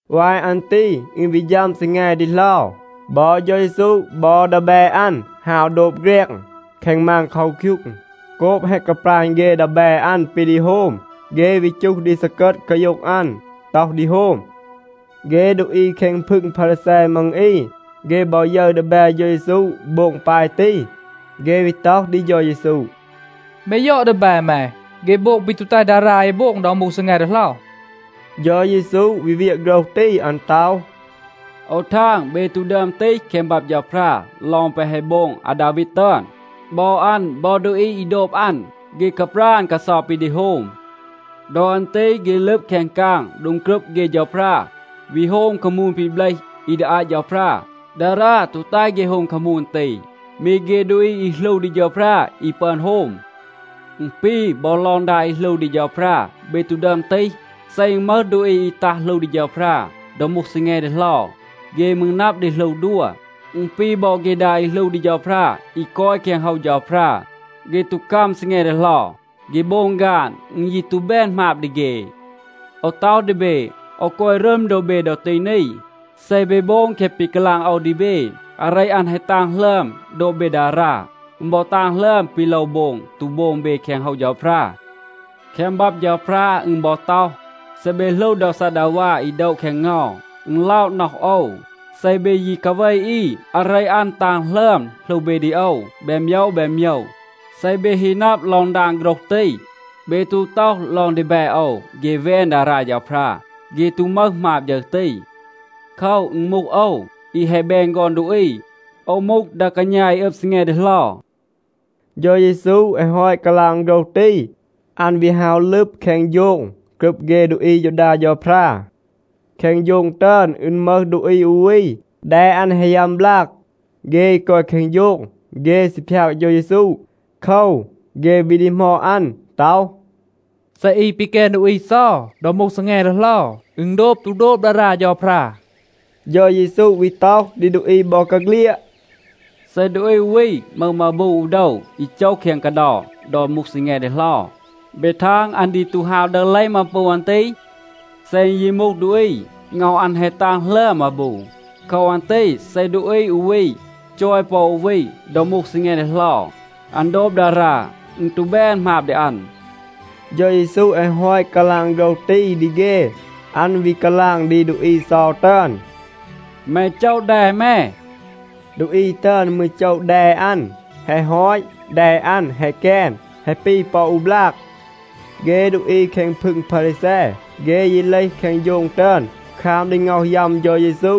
วาย อัน ตี อึณ วี ฌัม ซีแง ดีเหลา. บอ เฌา เยซู บอ ดีแบ อัน ฮาว โดบ แฆรง แคง มาน เคาคยูง. โกบ แฮะ กาปราณ เฆ ดีแบ อัน ปี ดี โฮม, เฆ วี จูห ดี ซีกัด กาโย็ง อัน, ต็อห ดี โฮม. เฆ ดูอี แคง พึง พารีแซ มัง อี, เฆ บอ ยึร ดีแบ เฌา เยซู โบง ปาย ตี, เฆ วี ต็อห ดี เฌา เยซู, “แม ยอด ดีแบ แม. เฆ โบง ปี ตู แตห ดารา เอ โบง ดอ มูห ซีแง ดีเหลา.” เฌา เยซู วี เวียะ โฆรห ตี. อัน ต็อห, “โอว ทาง, เบ ตู ดึอม ตีห แคง บับ เฌาพรา ลอง แปะ แฮะ โบง อาดาวีด ตึอน. บอ อัน บอ ดูอี อี โดบ อัน, เฆ กาปราณ กาเซา ปี ดี โฮม. ดอ อัน ตี เฆ ลึบ แคง กาง โดง กรึบ เฆ เฌาพรา, วี โฮม คามูน ปี เบลห อี ดี อาต เฌาพรา. ดารา ตู แตห เฆ โฮม คามูน ตี. มี เฆ ดูอี อี หลู ดี เฌาพรา อี ปึอน โฮม.a อึณ ปี, บอ ลอง ดา อี หลู ดี เฌาพรา เบ ตู ดึอม ตีห. เซ อึณ มึห ดูอี อี ตัห หลู ดี เฌาพรา ดอ มูห ซีแง ดีเหลา, เฆ มืร นับ ดี หลู ดัว. อึณ ปี บอ เฆ ดา อี หลู ดี เฌาพรา อี กอย แคง โฮว เฌาพรา, เฆ ตู กัม ซีแง ดีเหลา, เฆ โบง ฆาน. อึณ ยี ตู แบน หมาบ ดี เฆ. โอว ต็อห ดี เบ, โอว กอย รึม โดบ เบ ดอ ตี นี. เซ เบ โบง แคะ ปี กาลาง โอว ดี เบ, อาเร อัน แฮะ ตาง หลึอม โดบ เบ ดารา. อึณ บอ ตาง หลึอม ปี โลว โบง ตู โบง เบ แคง โฮว เฌาพรา. แคง บับ เฌาพรา อึณ บอ ต็อห, ‘เซ เบ หลู โดว ซัดดาวา อี โดะ แคง เงา, อึณ ล็อะ น็อห โอว. เซ เบ ยี กาเว อี, อาเร อัน ตาง หลึอม หลู เบ ดี โอว แบน โมยว แบน โมยว.’ เซ เบ ฮี นับ ลอง ดาง โฆรห ตี, เบ ตู ต็อห ลอง ดีแบ โอว เฆ แวน ดารา เฌาพรา. เฆ ตู มึห หมาบ ฌึร ตี. โคว, อึณ มูห โอว, อี แฮะ แบน ฆอน ดูอี, โอว มูห ดา กาณา อี อึบ ซีแง ดีเหลา.” เฌา เยซู แฮะ ฮอต กาลาง โฆรห ตี, อัน วี ฮาว ลึบ แคง โฌง กรึบ เฆ ดูอี อายูดา เฌาพรา. แคง โฌง ตึอน, อึณ มึห ดูอี อู วี, แด อัน แฮะ ยัม บลาก. เฆ อี กอย แคง โฌง, เฆ ซี พยาก เฌา เยซู. โคว, เฆ วี ดีหมอด อัน ต็อห, “เซ อี ปีแกน ดูอี เซา ดอ มูห ซีแง ดีเหลา, อึณ โดบ ตู โดบ ดารา เฌาพรา?” เฌา เยซู วี ต็อห ดี ดูอี บอกาเฆลียด, “เซ ดูอี อู วี มึห มาบู อู โดว อี โจห แคง กาเดา ดอ มูห ซีแง ดีเหลา, เบ ทาง, อัน ดี ตู ฮาว ดึห เลห มาบู อัน ตี? เซ อึณ ยี มูห ดูอี, ง็อห อัน แฮะ ตาง หลึอม มาบู. โคว อัน ตี เซ ดูอี อู วี จอย ปอ อู วี ดอ มูห ซีแง ดีเหลา, อัน โดบ ดารา. อึณ ตู แบน หมาบ ดี อัน.” เฌา เยซู แฮะ ฮอต กาลาง โฆรห ตี ดี เฆ, อัน วี กาลาง ดี ดูอี เซา ตึอน, “แม โจะ แด แม.” ดูอี ตึอน มืร โจะ แด อัน. แฮะ ฮอต, แด อัน แฮะ แกน, แฮะ ปี ปอ อู บลาก. เฆ ดูอี แคง พึง พารีแซ, เฆ ยี เลห แคง โฌง ตึอน, คราม ดี ง็อห ยัม เฌา เยซู,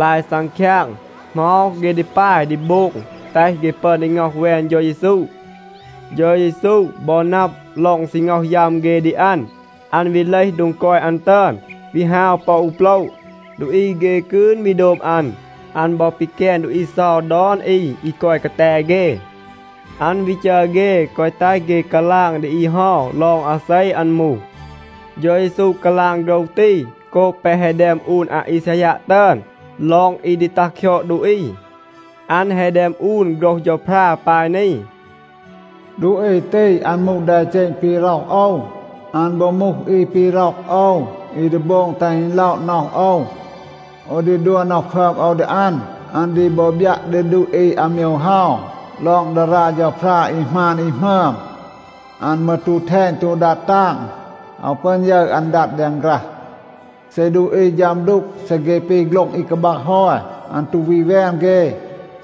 ลาย ซังคยาง, เหมา เฆ ดี ปาย ดี โบง แตห เฆ ปึอน ดี ง็อห แวน เฌา เยซู. เฌา เยซู บอ นับ ลอง ซี ง็อห ยัม เฆ ดี อัน, อัน วี เลห โดง กอย อัน ตึอน, วี ฮาว ปอ อู โปละ. ดูอี เฆ กืน วี โดบ อัน. อัน บอ ปีแกน ดูอี เซา ดอน อี อี กอย กาแต เฆ. อัน วี จัร เฆ, แกวะ แตห เฆ กาลาง ดี อี เฮา ลอง อาเซ อัน มูห. เฌา เยซู กาลาง โฆรห ตี, โกบ แปะ แฮะ แดม อูน อาอีซายัะ ตึอน ลอง อี ดี ตัห คยอด ดูอี. อัน แฮะ แดม อูน โฆรห เฌาพรา ปาย นี, “ดูอี ตี, อัน มูห แดเจณ ปี ร็อห โอว. อัน บอ มูห อี ปี ร็อก โอว, อี ดี โบง แตห อึณ ล็อะ น็อห โอว. โอว ดี ดัว น็อห พึอม โอว ดี อัน. อัน ดี บอ บยัะ ดี ดูอี อาโมยว เฮา ลอง ดารา เฌาพรา อี หมาน อี หมึอม. อัน มืร ตู แทณ ตู ดัด ตาง. อาว ปึอน ยึร อัน ดัด แดง ฆรัห. เซ ดูอี ฌัม ดูก, เซ เฆ ปี โฆ็ลง อี กาบัก ฮอย, อัน ตู วี แวน เฆ.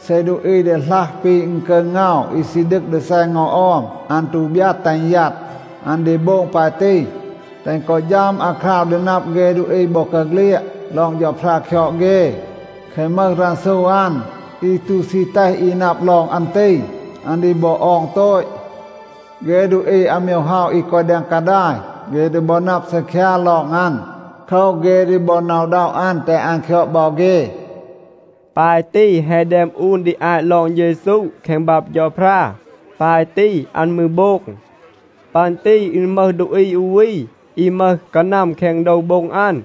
เซ ดูอี ดีหลัห ปี อึณกึร เงา อี ซี ดึก ดี แซ เงา ออม, อัน ตู บยัด แตห อึณ ยัด. อัน ดี โบง ปาย ตี, แตห อึณ กอ ฌัม อาคราว ดอ นับ เฆ ดูอี บอกาเฆลียด ลอง เฌาพรา คยอด เฆ. แคะ มึห รันซู อัน, อี ตู ซี แตห อี นับ ลอง อัน ตี, อัน ดี บอ ออง โตต. เฆ ดูอี อาโมยว เฮา อี กอย แดง กาดาย, เฆ ดี บอ นับ ซีคยา ลอง อัน. โคว, เฆ ดี บอ หน็อะ อึณด็อะ อัน, แตห อัน คยอด บอ เฆ.” ปาย ตี แฮะ แดม อูน ดี อาต ลอง เฌา เยซู แคง บับ เฌาพรา. ปาย ตี อัน มืร โบง. ปัน ตี อึณ มึห ดูอี อู วี, อี มึห กานัม แคง โดว โบ็ง อัน.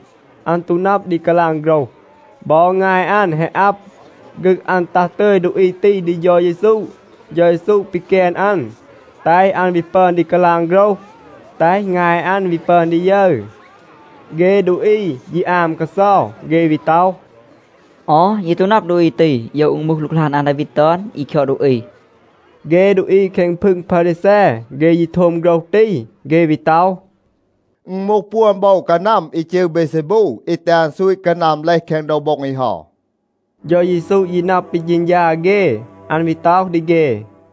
อัน ตู นับ ดี กาลาง โฆรห. บอ งาย อัน แฮะ อับ. ฆึก อัน ตัห ตึย ดูอี ตี ดี เฌา เยซู. เฌา เยซู ปีแกน อัน, แตห อัน วี ปึอน ดี กาลาง โฆรห, แตห งาย อัน วี ปึอน ดี ยึร. เฆ ดูอี ยี อาม กาเซา. เฆ วี ต็อห, “ออ, เย ตู นับ ดูอี ตี, โยว อึณ มูห หลูกหลาน อาดาวีด ตึอน อี คยอด ดูอี.” เฆ ดูอี แคง พึง พารีแซ, เฆ ยี โทม โฆรห ตี, เฆ วี ต็อห, “อึณ มูห ปวน โบว กานัม อี จืร เบเซบู, อี แตห อัน ซูต กานัม เลห แคง โดว โบ็ง อี เฮา.” เฌา เยซู ยี นับ ปี เฌณฌา เฆ. อัน วี ต็อห ดี เฆ,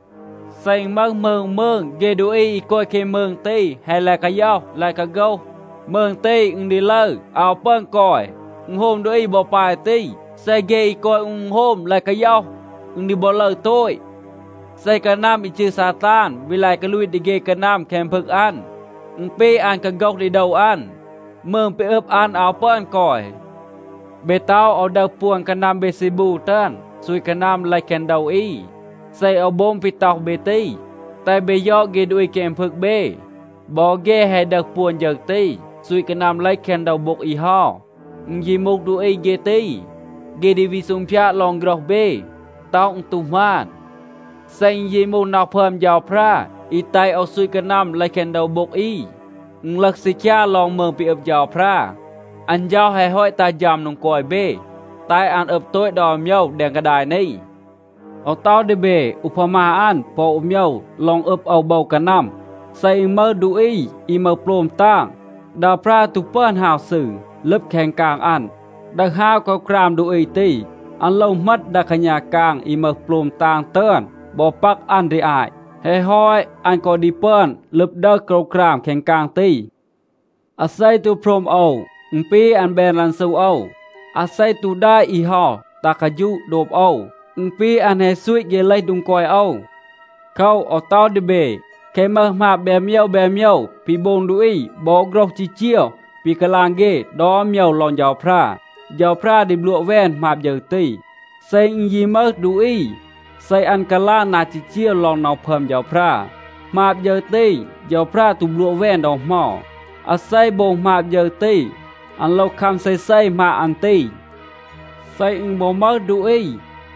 “เซ อึณ มึห มืง อู มืง, เฆ ดูอี อี กอย แคง มืง ตี แฮะ ลาย กาย็อห, ลาย กาโฆห, มืง ตี, อึณ ดี ลึร. อาว ปึอน กอย. อึณโฮม ดูอี บอ ปาย ตี. เซ เฆ อี กอย อู อึณโฮม ลาย กาย็อห, อึณ ดี บอ ลึร โตต. เซ กานัม อี จืร ซาตาน วี ลาย กาลูต ดี เฆ กานัม แคง พึง อัน, อึณ ปี อัน กาโฆห ดี โดว อัน. มืง ปี อึบ อัน อาว ปึอน กอย. เบ ต็อห, โอว ดึห ปวน กานัม เบเซบู ตึอน, ซูต กานัม เลห แคง โดว อี. เซ โอว โบง ปี ต็อห เบ ตี, แตห เบ ยอด เฆ ดูอี แคง พึง เบ. บอ เฆ แฮะ ดึห ปวน ฌึร ตี, ซูต กานัม เลห แคง โดว โบ็ง อี เฮา. อึณ ยี มูห ดูอี เฆ ตี, เฆ ดี วี ซูงพยาด ลอง โฆรห เบ, ต็อห อึณ ตู หมาน. เซ อึณ ยี มูห น็อห พึอม เฌาพรา, อี แตห โอว ซูต กานัม เลห แคง โดว โบ็ง อี, อึณ ลึห ซีคยา ลอง มืง ปี อึบ เฌาพรา. อัน เฌา แฮะ ฮอต ตัห ฌัม โดง กอย เบ, แตห อัน อึบ โตต ดอน โมยว แดง กาดาย นี. โอว ต็อห ดี เบ อูพามา อัน ปอ อู โมยว ลอง อึบ โอว โบว กานัม. เซ อึณ มึห ดูอี อี มึห โปลม ตาง, ดา ปรา ตู ปึอน ฮาว ซืร, ลึบ แคง กาง อัน, ดึห ฮาว โกรวกราม ดูอี ตี. อัน โลว เหมต ดา กาณา กาง อี มึห โปลม ตาง ตึอน บอ ปัก อัน ดี อาต. แฮะ ฮอต, อัน กอ ดี ปึอน ลึบ ดึห โกรวกราม แคง กาง ตี. อาเซ ตู โพรม โอว, อึณ ปี, อัน แบน รันซู โอว. อาเซ ตู แดะ อี เฮา ตัห กาฌูะ โดบ โอว, อึณ ปี อัน แฮะ ซูต เฆ เลห โดง กอย โอว. โคว, โอว ต็อห ดี เบ, แคะ มึห หมาบ แบน โมยว แบน โมยว ปี โบง ดูอี บอ โฆรห จีจีว ปี กาลาง เฆ ดอน โมยว ลอง เฌาพรา, เฌาพรา ดี บลัวะ แวน หมาบ ฌึร ตี. เซ อึณ ยี มึห ดูอี, เซ อัน กาลาง นา จีจีว ลอง น็อห พึอม เฌาพรา, หมาบ ฌึร ตี, เฌาพรา ตู บลัวะ แวน ดอ เหมา. อาเซ โบง หมาบ ฌึร ตี, อัน โลว คัม เซเซ หมาบ อัน ตี. เซ อึณ บอ มึห ดูอี,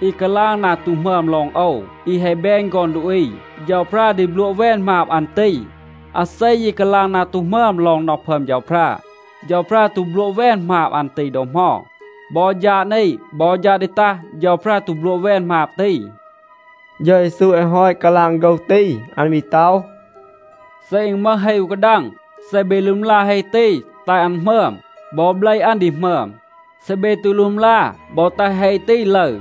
อี กาลาง นา ตู หมึอม ลอง โอว, อี แฮะ แบน ฆอน ดูอี, เฌาพรา ดี บลัวะ แวน หมาบ อัน ตี. อาเซ ยี กาลาง นา ตู หมึอม ลอง น็อห พึอม เฌาพรา, เฌาพรา ตู บลัวะ แวน หมาบ อัน ตี ดอ เหมา. บอ ฌาด นี, บอ ฌาด ดี ตัห, เฌาพรา ตู บลัวะ แวน หมาบ ตี.” เฌา เยซู แฮะ ฮอต กาลาง โฆรห ตี, อัน วี ต็อห, “เซ อึณ มึห เฮ อู กาดัง, เซ เบ ลึมลา เฮ ตี แตห อัน หมึอม, บอ เบล อัน ดี หมึอม. เซ เบ ตู ลึมลา บอ แตห เฮ ตี ลึร,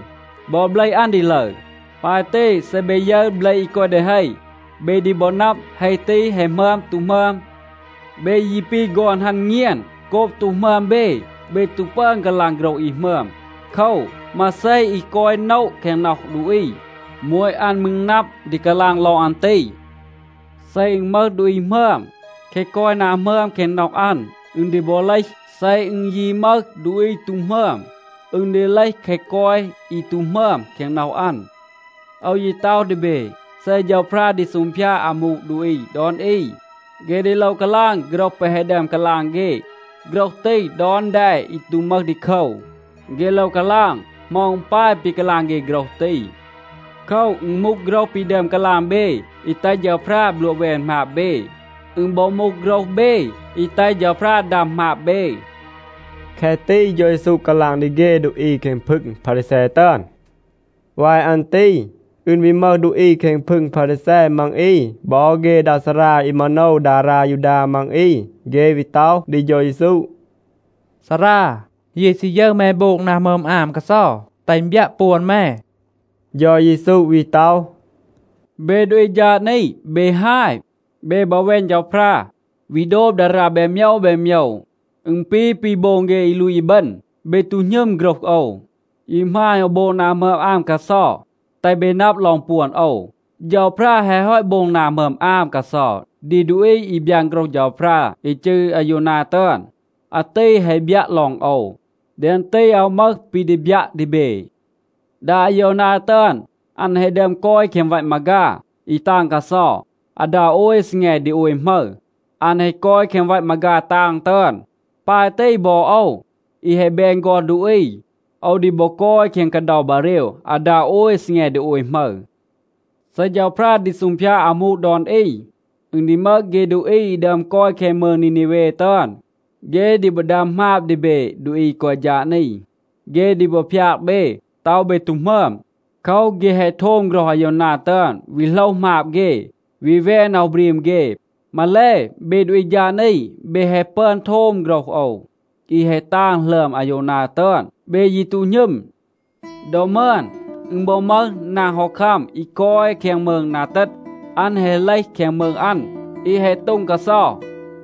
บอ เบล อัน ดี ลึร. ปาย ตี, เซ เบ ยึร เบล อี กอย ดี เฮ, เบ ดี บอ นับ, เฮ ตี แฮะ หมึอม ตู หมึอม. เบ ยี ปี ฆอน ฮัณ เงียน. โกบ ตู หมึอม เบ, เบ ตู ปึอน กาลาง โฆรห อี หมึอม. โคว, มาเซ อี กอย โนะ แคง น็อห ดูอี, โมต อัน มืร นับ ดี กาลาง ลอง อัน ตี. เซ อึณ มึห ดูอี หมึอม, แคะ กอย นา หมึอม แคง น็อห อัน, อึณ ดี บอ เลห. เซ อึณ ยี มึห ดูอี ตู หมึอม, อึณ ดี เลห แคะ กอย อี ตู หมึอม แคง น็อห อัน. โอว ยี ต็อห ดี เบ, เซ เฌาพรา ดี ซูงพยาด อามู ดูอี ดอน อี, เฆ ดี โลว กาลาง โฆรห แปะ แฮะ ดึอม กาลาง เฆ. โฆรห ตี ดอน แด อี ตู มึห ดีโคว, เฆ โลว กาลาง, เหมา อึณ ปาย ปี กาลาง เฆ โฆรห ตี. โคว, อึณ มูห โฆรห ปี ดึอม กาลาง เบ อี แตห เฌาพรา บลัวะ แวน หมาบ เบ. อึณ บอ มูห โฆรห เบ อี แตห เฌาพรา ดัม หมาบ เบ.” แคะ ตี เฌา เยซู กาลาง ดี เฆ ดูอี แคง พึง พารีแซ ตึอน. วาย อัน ตี อึณ วี มึห ดูอี แคง พึง พารีแซ มัง อี บอ เฆ ดา ซารา อี มาโนว ดารา ยูดา มัง อี. เฆ วี ต็อห ดี เฌา เยซู, “ซารา, เย ซี ยึร แม โบง นา หมึอม อาม กาเซา, แตห อึณ บยัะ ปวน แม.” เฌา เยซู วี ต็อห, “เบ ดูอี ฌาด นี, เบ ฮาย. เบ บอ แวน เฌาพรา, วี โดบ ดารา แบน โมยว แบน โมยว. อึณ ปี ปี โบง เฆ อี ลูต อีบึณ. เบ ตู หณึม โฆรห โอว, ยี หมาณ โอว โบง นา หมึอม อาม กาเซา, แตห เบ นับ ลอง ปวน โอว. เฌาพรา แฮะ ฮอต โบง นา หมึอม อาม กาเซา ดี ดูอี อี บยาน โฆรห เฌาพรา อี จืร อาโยวนา ตึอน. อาตี แฮะ บยัะ ลอง โอว. แดง ตี อาว มึห ปี ดี บยัะ ดี เบ. ดา อาโยวนา ตึอน, อัน แฮะ ดึอม กอย แคง วัต มาฆา อี ตาง กาเซา. อาดา โอย ซีแง ดี โอย หมึร อัน แฮะ กอย แคง วัต มาฆา ตาง ตึอน. ปาย ตี บอ โอว, อี แฮะ แบน ฆอน ดูอี, โอว ดี บอ กอย แคง กาเดา บาเรว อาดา โอย ซีแง ดี โอย หมึร. เซ เฌาพรา ดี ซูงพยาด อามู ดอน อี, อึณ ดี มึห เฆ ดูอี อี ดึอม กอย แคง มืง นีนีเว ตึอน, เฆ ดี บอ ดัม หมาบ ดี เบ ดูอี อี กอย ฌาด นี. เฆ ดี บอ พยาก เบ, ต็อห เบ ตู หมึอม. โคว, เฆ แฮะ โทม โฆรห อาโยวนา ตึอน, วี โหลห หมาบ เฆ, วี แวน น็อห บรีม เฆ. มาแล, เบ ดูอี ฌาด นี, เบ แฮะ ปึอน โทม โฆรห โอว, อี แฮะ ตาง หลึอม อาโยวนา ตึอน. เบ ยี ตู หณึม. ดอ มึอน, อึณ บอ มึห นาง ฮอคัม, อี กอย แคง มืง นา เตต. อัน แฮะ เลห แคง มืง อัน, อี แฮะ โต็ง กาเซา,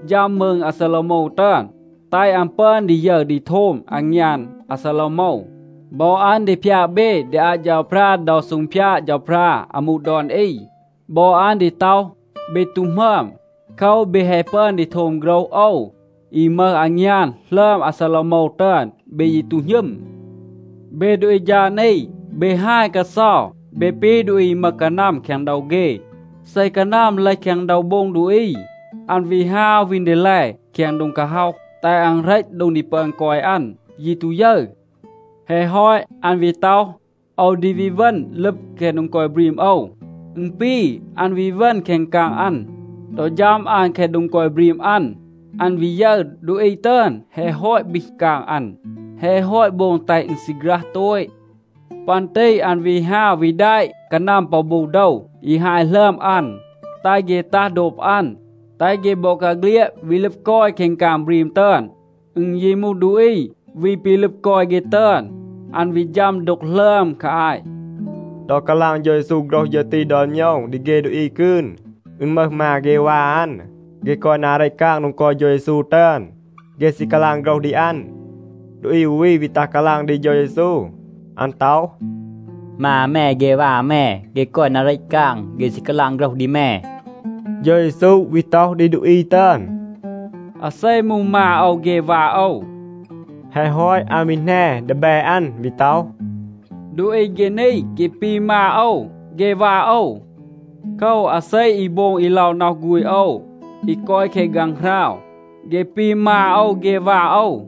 ฌัม มืง อาซาโลวโมว ตึอน, แตห อัน ปึอน ดี ยึร ดี โทม อางยาน อาซาโลวโมว. บอ อัน ดี พยาก เบ ดี อาต เฌาพรา ดอ ซูงพยาด เฌาพรา อามู ดอน อี. บอ อัน ดี ต็อห, เบ ตู หมึอม. โคว, เบ แฮะ ปึอน ดี โทม โฆรห โอว อี มึห อางยาน หลึอม อาซาโลวโมว ตึอน. เบ ยี ตู หณึม. เบ ดูอี ฌาด นี, เบ ฮาย กาเซา. เบ ปี ดูอี อี มึห กานัม แคง โดว เฆ. เซ กานัม เลห แคง โดว โบ็ง ดูอี, อัน วี ฮาว วีน ดีแล แคง โดง กาฮ็อห, แตห อัน เหรต โดง ดี ปึอน กอย อัน, ยี ตู ยึร. แฮะ ฮอต, อัน วี ต็อห, ‘โอว ดี วี เวณ ลึบ แคง โดง กอย บรีม โอว.’ อึณ ปี, อัน วี เวณ แคง กาง อัน. ดอ ฌัม อัน แคง โดง กอย บรีม อัน, อัน วี ยึร, ดูอี ตึอน แฮะ ฮอต บีห กาง อัน, แฮะ ฮอต โบง แตห อึณ ซีฆรัห โตต. ปัน ตี อัน วี ฮาว วี แดะ กานัม ปอ บู โดว อี ฮาย หลึอม อัน, แตห เฆ ตัห โดบ อัน, แตห เฆ บอกาเฆลียด วี ลึบ กอย แคง กาง บรีม ตึอน. อึณ ยี มูห ดูอี วี ปี ลึบ กอย เฆ ตึอน, อัน วี ฌัม ดูก หลึอม คา อาต.” ดอ กาลาง เฌา เยซู โฆรห ฌึร ตี ดอน โมยว ดี เฆ ดูอี กืน, อึณ มึห มา เฆ วา อัน, เฆ กอย นา เรต กาง โดง กอย เฌา เยซู ตึอน. เฆ ซี กาลาง โฆรห ดี อัน. ดูอี อู วี วี ตัห กาลาง ดี เฌา เยซู. อัน ต็อห, “มา แม เฆ วา แม, เฆ กอย นา เรต กาง. เฆ ซี กาลาง โฆรห ดี แม.” เฌา เยซู วี ต็อห ดี ดูอี ตึอน, “อาเซ มูห มา โอว เฆ วา โอว?” แฮะ ฮอต, อัน วี แหน ดีแบ อัน วี ต็อห, “ดูอี เฆ นี, เฆ ปี มา โอว เฆ วา โอว. โคว, อาเซ อี โบง อี ล็อะ น็อห ฆูณ โอว อี กอย แคง ฆางหราว, เฆ ปี มา โอว เฆ วา โอว.”